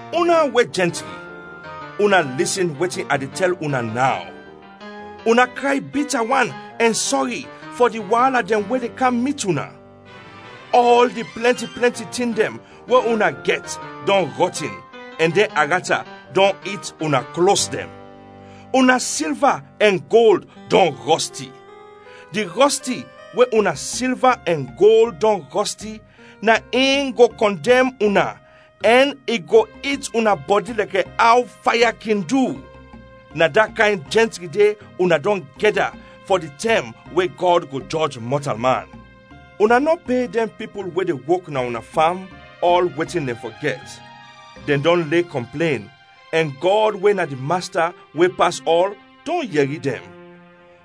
Una we jɛntri, una lisin wetin a de tɛl una naw. Una kray bita wan ɛn sɔri fɔ di waala dɛn we de kam mit una. Ɔl di plɛnti plɛnti tin dɛn we una gɛt dɔn rɔtin ɛn dɛn arata dɔn it una klos dɛn. Una silva ɛn gold dɔn rɔsti. Di rɔsti we una silva ɛn gold dɔn rɔsti, na in go kɔndɛm una ɛn i go it una bɔdi lɛkɛ aw faya kin du. Na da kayn jɛntri de una dɔn gɛda fɔ di tɛm we Gɔd go jɔj mɔtalman. Una nɔ pe dɛn pipul we de wok na una fam ɔl wetin dɛn fɔ gɛt. Dɛn dɔn le kɔmplen ɛn Gɔd we na di Masta we pas ɔl, dɔn yɛri dɛn.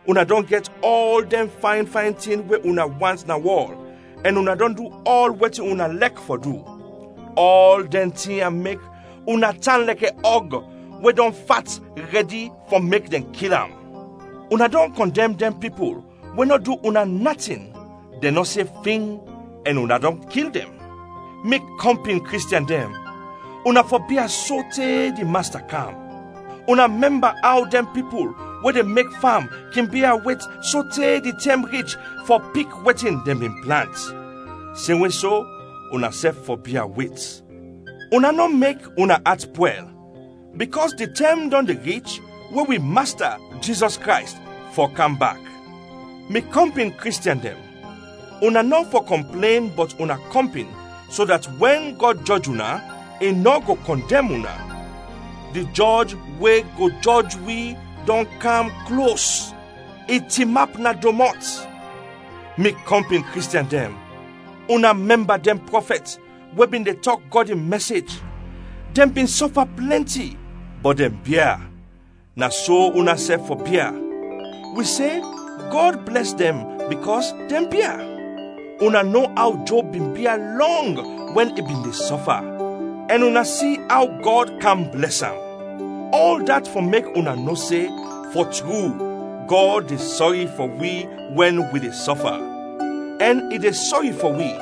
Una dɔn gɛt ɔl dɛn fayn fayn tin we una want na wɔl, ɛn una dɔn du ɔl wetin una lɛk fɔ du. Ɔl dɛn tin ya mek una tan lɛkɛ ɔg we dɔn fat rɛdi fɔ mek dɛn kil am. Una dɔn kɔndɛm dɛn pipul we nɔ du una natin; dɛn nɔ se fing, ɛn una dɔn kil dɛn. Mi kɔmpin Kristiɛn dɛn, una fɔ bia sote di Masta kam. Una mɛmba aw dɛn pipul we de mek fam kin bia wet sote di tɛm rich fɔ pik wetin dɛn bin plant. Semwe so, unasɛf fɔ bia wet. Una nɔ mek una at pwɛl bikɔs di tɛm dɔn de rich we wi Masta Jizɔs Krays fɔ kam bak. Mi kɔmpin Kristiɛn dɛn, una nɔ fɔ kɔmplen bɔt una kɔmpin, so dat wɛn Gɔd jɔj una, i nɔ go kɔndɛm una. Di Jɔj we go jɔj wi dɔn kam klos, i tinap na domɔt. Mi kɔmpin Kristiɛn dɛn, una mɛmba dɛn prɔfɛt we bin de tɔk Gɔd in mɛsej, dɛn bin sɔfa plɛnti, bɔt dɛn bia; na so unasɛf fɔ bia. Wi se Gɔd blɛs dɛn bikɔs dɛn bia. Una no aw Job bin bia lɔng wɛn i bin de sɔfa, ɛn una si aw Gɔd kam blɛs am. Ɔl dat fɔ mek una no se fɔ tru, Gɔd de sɔri fɔ wi wɛn wi de sɔfa, ɛn i de sɔri fɔ wi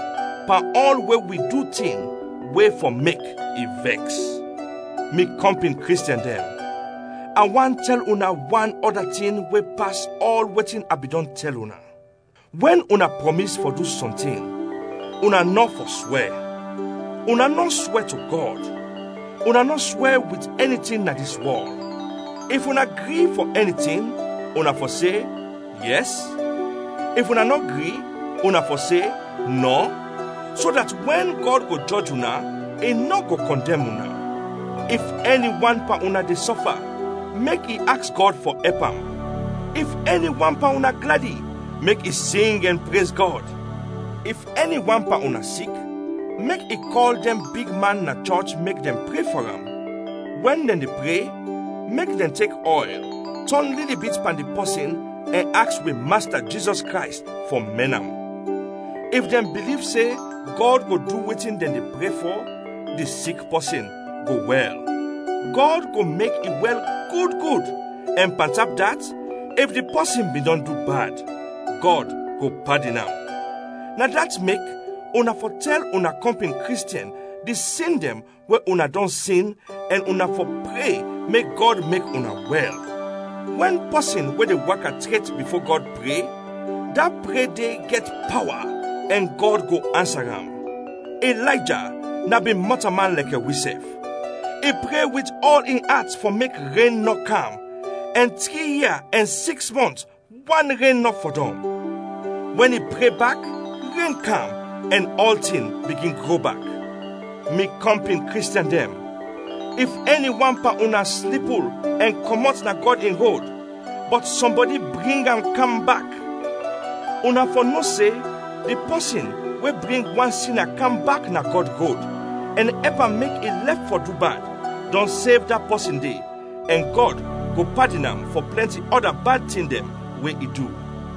pan ɔl we wi du tin we fɔ mek i vɛks. Mi kɔmpin Kristiɛn dɛn, a want tɛl una wan ɔda tin we pas ɔl wetin a bin dɔn tɛl una. Wɛn una prɔmis fɔ du sɔntin, una nɔ fɔ swɛ. Una nɔ swɛ to Gɔd, una nɔ swɛ wit ɛni tin na dis wɔl. If una gri fɔ ɛni tin, una fɔ se, “Yɛs;” if una nɔ gri, una fɔ se, “Nɔ,” so dat wɛn Gɔd go jɔj una, i nɔ go kɔndɛm una. If ɛni wan pan una de sɔfa, mek i aks Gɔd fɔ ɛp am. If ɛni wan pan una gladi, mek i sing ɛn prez Gɔd. If ɛni wan pan una sik, mek i kɔl dɛn bigman na chɔch mek dɛn pre fɔ am. Wɛn dɛn de pre, mek dɛn tek ɔyl tɔn lili bit pan di pɔsin ɛn aks wi Masta Jizɔs Krays fɔ mɛn am. If dɛn biliv se Gɔd go du wetin dɛn de pre fɔ, di sik pɔsin go wɛl. Gɔd go mek i wɛl gud gud, ɛn pantap dat, if di pɔsin bin dɔn du bad, Gɔd go padin am. Na dat mek, una fɔ tɛl una kɔmpin Kristiɛn di sin dɛn we una dɔn sin ɛn una fɔ pre mek Gɔd mek una wɛl. Wɛn pɔsin we de waka tret bifo Gɔd pre, da pre de gɛt pawa ɛn Gɔd go ansa am. Ilayja na bin mɔtalman lɛkɛ wisɛf. I pre wit ɔl in at fɔ mek ren nɔ kam ɛn tri ia ɛn siks mɔnt wan ren nɔ fɔdɔm. Wɛn i pre bak ren kam ɛn ɔltin bigin gro bak. Mi kɔmpin Kristiɛn dɛn, if ɛni wan pan una slipul ɛn kɔmɔt na Gɔd in rod, bɔt sɔmbɔdi bring am kam bak, una fɔ no se, di pɔsin we bring wan sina kam bak na Gɔd rod ɛn ɛp am mek i lɛf fɔ du bad, dɔn sev da pɔsin de ɛn Gɔd go padin am fɔ plɛnti ɔda bad tin dɛn we i du.